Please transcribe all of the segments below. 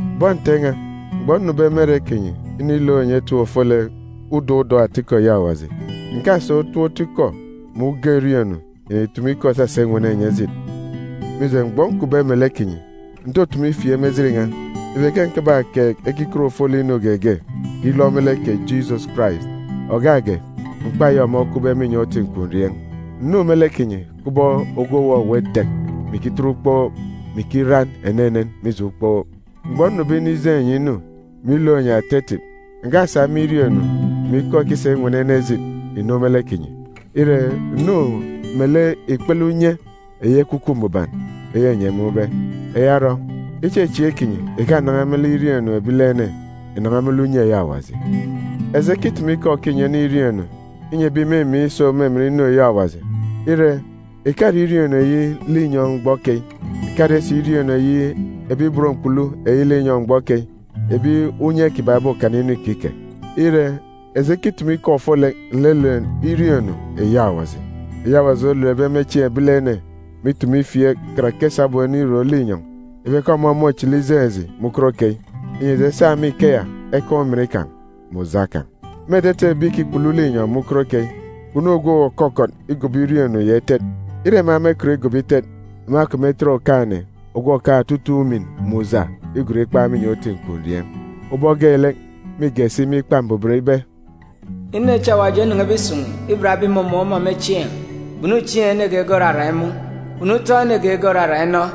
Bọn Nte n̄a, mgbọ nnube me ere kinyi inilook enyi etip ofolek udọk udọk atikọ eyi Awaji, ǹkasa utop otu ikọ mè uga iriọọn̄-inu ìnitumu ikọ isasa inwene enyi ejit. Mije, mgbọ nkupbe melek kinyi, ǹtutumu ifieek me ejit n̄a ibe ke ǹkabakeek ekiket ofolek inu geege, ilọ me lek kè Jisọs Karais, ògak ge, mkpa eyi ọmọ okwube me inyọn̄ uti nkwurieen̄. Ǹnu me lek kinyi kubọk ogwu òwọwọ idek, mè ikitet ukpook, mè ikiran enenen mije ukpook. Mgbọ nnube inijeen̄ enyi inu, mè ilook enyi ata etip, ǹkasa me iriọọn̄-inu mè ikọ ekisa inwene ene ejit ìnu me lek kinyi. Ire, ǹnu melek ikpele unye eyi Ekwukwu Mbuban eyi enyi emun̄be. Eya orọ, ichechieek kinyi ìkanan̄a me lek iriọọn̄-inu ebilene, ìnan̄a me lek unye eyi Awaji. Eji ekitumu ikọ òkinyi ene iriọọn̄-inu inyi ebi ìmimiin̄ iso me emen inu eyi Awaji. Ire, ìkare iriọọn̄-inu eyi linyọn̄ mgbọ keyi, ìkare si iriọọn̄-inu eyi ebi ibot mkpulu eyi linyọn̄ mgbọ keyi, ebi unye kiban̄ obokana inu ikike. Ire, eji ekitumu ikọ ofolek nlelet iriọọn̄-inu eyi Awaji, eyi Awaji oletbe me chieen̄ ebilene mè itumu ifieek, karake sabum enirom linyọn̄, ibe ke ọmọ môchili ijeen̄ eji me ukot keyi, inyi eji esa me ikeya ekaan̄ ujamgbugbo kan̄. Me etete ebi ìkikpulu linyọn̄ me ukot keyi, kpunu ogwu òkọkọt igobo iriọọn̄-inu ya itet. Ire ema mekọt igobo itet, ema kpemetet Okaan̄-ene, ogwu òkaan̄ otutuuk ujamgbugbo, igon ikpan̄ me inyọn̄ uti nkwurieen̄. Ubọk geelek, mîge si me Ikpa Mbuban ibe, “Inu echi Awaji onen̄ebe isun̄ iban ebi ìmumun̄ ọmọ me chieen̄, kpunu chieen̄ ene geege òrarak imun̄, kpunu utọn̄ ene geege òrarak inọ,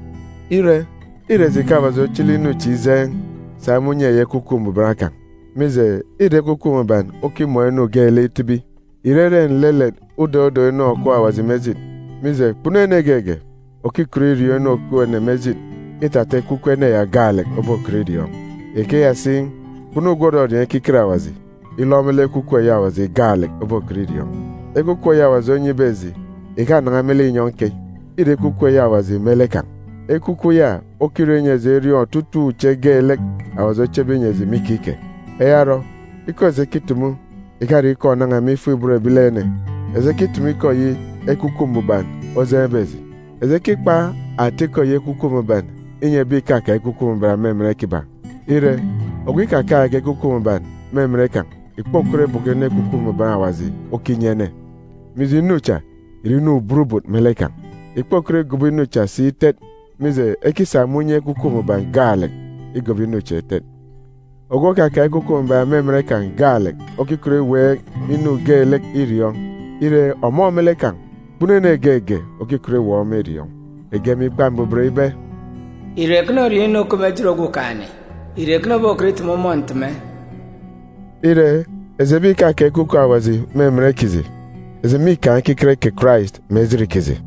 Ire, îre eji ke Awaji ochili inu chi ijeen̄, sa me unye eyi Ekwukwu Mbuban kan̄. Mije, îre Ekwukwu Mbuban okimọọn̄ inu geelek itibi, ìrere nlelet udọk udọk inu òkup Awaji me ejit. Mije, kpunu ene geege òkikọt iriọọn̄ inu òkup ene me ejit, îtata ekwukwu ene ya gaalek obokọt iriọọn̄. Ikeya si, kpunu ogwu òrọriọọn̄ ekiket Awaji, ilọ me lek Ekwukwu Awaji, ọmọ gaalek obokọt iriọọn̄. Ekwukwu eyi Awaji onyibe eji ìkanan̄a me linyọn̄ keyi, îre Ekwukwu Awaji me lek kan̄. Ekwukwu ya okirọ inyi eji eriọọn̄ otutuuk uche geelek Awaji ochebe inyi eji me ikike. Eya orọ, ikọ eji ekitumu ìkare ikọ ònan̄a me ifuk-ibot ebilene. Eji ekitumu ikọ eyi Ekwukwu Mbuban ojeen̄be eji. Eji ekikpa atikọ eyi Ekwukwu Mbuban inyi ebi ìkakaan̄ Ekwukwu Mbuban me emen kiban̄. Ire, ogwu ikakaan̄ge Ekwukwu Mbuban me emen kan̄ ìkpokọt ibọkọ inu Ekwukwu Mbuban Awaji okinyi ene, mije, inu cha ìre inu burubut me lek kan̄. Ìkpokọt igobo inu cha si itet, mije, ekisa me unye Ekwukwu Mbuban gaalek igobo inu cha itet. Ogwu òkakaan̄ Ekwukwu Mbuban me emen gaalek okikọt iweek inu geelek iriọọn̄. Ire, ọmọ me lek kan̄, kpunu ene geege òkikọt iweek ọmọ iriọọn̄. Ege me Ikpa Mbuban ibe, “Ìre ekene oriọọn̄ inu òkup me ejit Okumugwem? Ìre ekene obokọt iteme ọmọ nteme?”b Ire, eji ebi ìkakaan̄ Ekwukwu Awaji me emen kiji, eji mîkaan̄ ekiket kè Karais me ejit kiji.